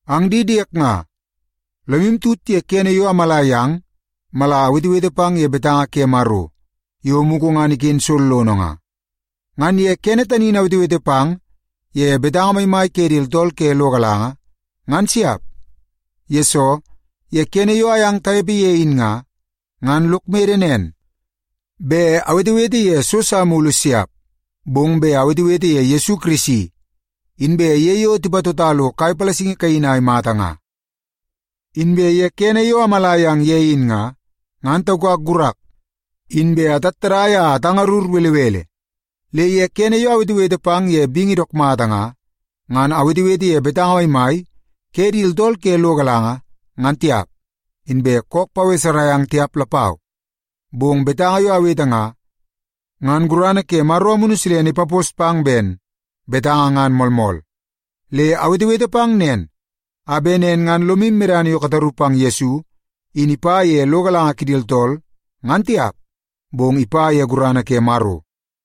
Ang di diek nga, lomu tut ye kene yo amala yang mala awetewete pang ye betanga ke Maro yo mugu ngan iken sollono nga. Ngan ye kene tani in awetewete pang ye betanga maimai ke di tooltool ke lo galanga, ngan siap. Yesoo, ye kene yo ayang tanepe ye in nga, ngan lok mede nen, bet awetewete ye so sa mulu siap, bong bet awetewete ye Yesu Kirisi, inbe ye yo tipatota lo kai palasingi kaini a imata nga. Inbe ye kene yo amala yang ye in nga, ngan taukak gurak, inbe atattadai a atangarur belebele. Le ye kene yo awetewete pang ye bingi dook mata nga, ngan awetewete ye betanga maimai ke di tooltool ke lo galanga ngan tiap, inbe kook paweserai ang tiap lapau. Bong betanga yo awete nga, ngan gurana ke Maro Amunu Silene ipapos pang ben betanga ngan moolmool. Le awetewete pang nen, a bet nen ngan lomu medana yo kataru pang Yesu in ipa ye lo galanga kidi tooltool, ngan tiap, bong ipa ye gurana ke Maro.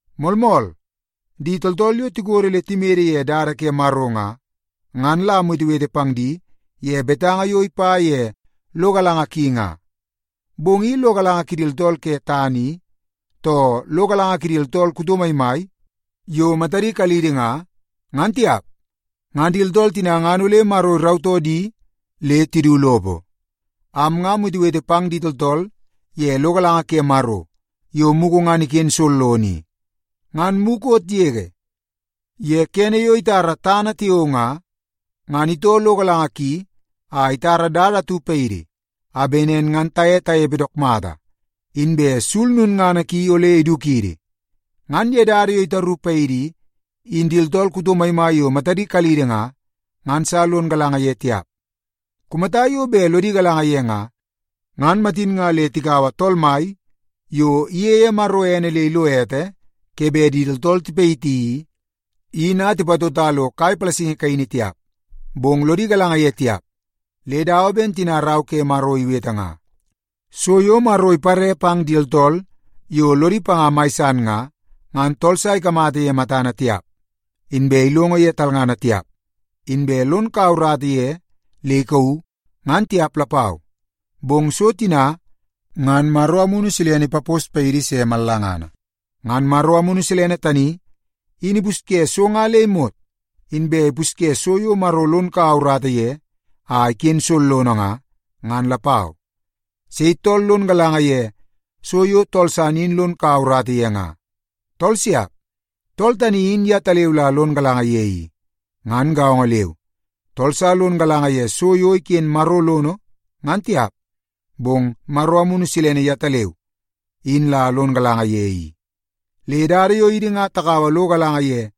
Moolmool, di tooltool yo tikodo le timede ye dada ke Maro nga, ngan la amwetewete pang di ye betanga yo ipa ye lo galanga ki nga. Bong i lo galanga kidi tooltool ke tana i, too lo galanga kidi tooltool kuto maimai yo matadi kalidi nga, ngan tiap. Ngan di tooltool tina ngan ole Maro irautoo di le tidu lopo. Am nga amwetewete pang di tooltool ye lo galanga ke Maro yo mugu ngan iken sollono i. Ngan mukot yege ye kene yo itara tana tiao nga, ngan itoo lo galanga ki a itara dada atu paidi a bet nen ngan taye tanepe dook mata, inbe sul lulngana ki ole idukidi. Ngan dada tani yo itaru paidi i, in di tooltool kuto maimai yo matadi kalidi nga, ngan sa lon galanga ye tiap. Kumata yo bet lodi galanga ye nga, ngan matin nga le tikaua Tool Mai yo iyeie Maro ene le ilo ete ke bet di tooltool tipayiti i, in a tipatota lo kai palasingi kaini tiap. Bong lodi galanga ye tiap le dawa ben tina Rau ke Maro iwete nga: “So yo Maro ipare pang di tooltool yo lodi panga mai san nga, ngan tool sa ikamata ye matana tiap, inbe ilongo ye talngana tiap, inbe lon kau urata ye le ikauu, ngan tiap lapau.” Bong so tina, ngan Maro Amunu Silene ipapos paidi se mallangana. Ngan Maro Amunu Silene tani in ipusye so nga le imot, inbe ipusye so yo Maro lon kaua urata ye a iken sollono nga, ngan lapau. Sei tool lon galanga ye so yo tool san in lon kaua urata ye nga? Tool siap! Tool tani in yetaleu la lon galanga ye i. Ngan gaongo leu, tool sa lon galanga ye so yo iken Maro lono ngan tiap, bong Maro Amunu Silene yetaleu in la lon galanga ye i. Le dada yo idi nga takaua lo galanga ye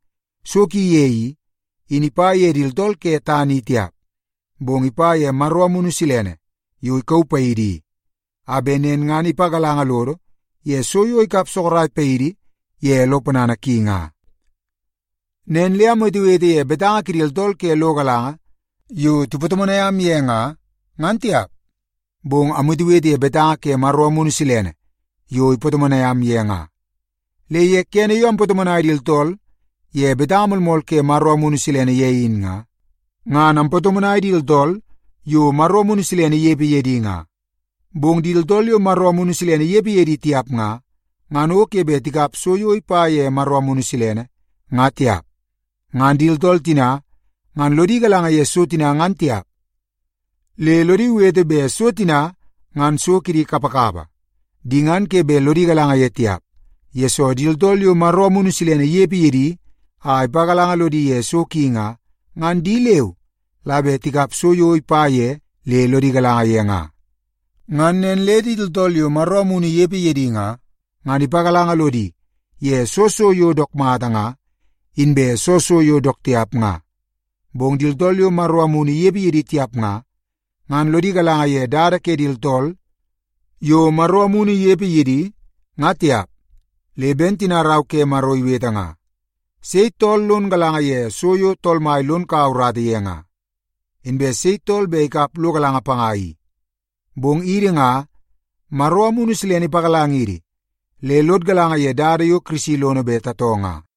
so ki ye i, in ipa ye di tooltool ke tana i tiap. Bong ipa ye Maro Amunu Silene yo ikauu paidi i, a bet nen ngan ipagalanga lodo ye so yo ikap sorok paidi ye lo ponana ki nga. Nen le amwetewete ye betanga kidi tooltool ke lo galanga yo tipatomonai am ye nga, ngan tiap, bong amwetewete ye betanga ke Maro Amunu Silene yo ipatomonai am ye nga. Le ye kene yo ampatomonai di tooltool ye betanga moolmool ke Maro Amunu Silene ye in nga, ngan ampatomonai di tooltool yo Maro Amunu Silene inepe ye di nga. Bong di tooltool yo Maro Amunu Silene inepe ye di tiap nga, ngan o ke bet tikap so yo ipa ye Maro Amunu Silene, ngan tiap. Ngan di tooltool tina ngan lodi galanga ye so tina ngan tiap, le lodi wete bet so tina ngan so kidi kapakapa. Di ngan ke bet lodi galanga ye tiap, yesoo di tooltool yo Maro Amunu Silene inepe ye di a ipagalanga lodi ye so ki nga, ngan di leu la bet tikap so yo ipa ye le lodi galanga ye nga. Ngan nen le di tooltool yo Maro Amunu inepe ye di nga, ngan ipagalanga lodi ye soo so yo dook mata nga, inbe soo so yo dook tiap nga. Bong di tooltool yo Maro Amunu inepe ye di tiap nga, ngan lodi galanga ye dada ke di tooltool yo Maro Amunu inepe ye di, nga tiap. Le ben tina Rau ke Maro iwete nga, “Sei tool lon galanga ye so yo Tool Mai lon kaua urata ye nga? Inbe sei tool bet ikap lo galanga panga i?” Bong idi nga, Maro Amunu Silene ipagalangidi le lod galanga ye dada yo Kirisi lono bet tatoo nga.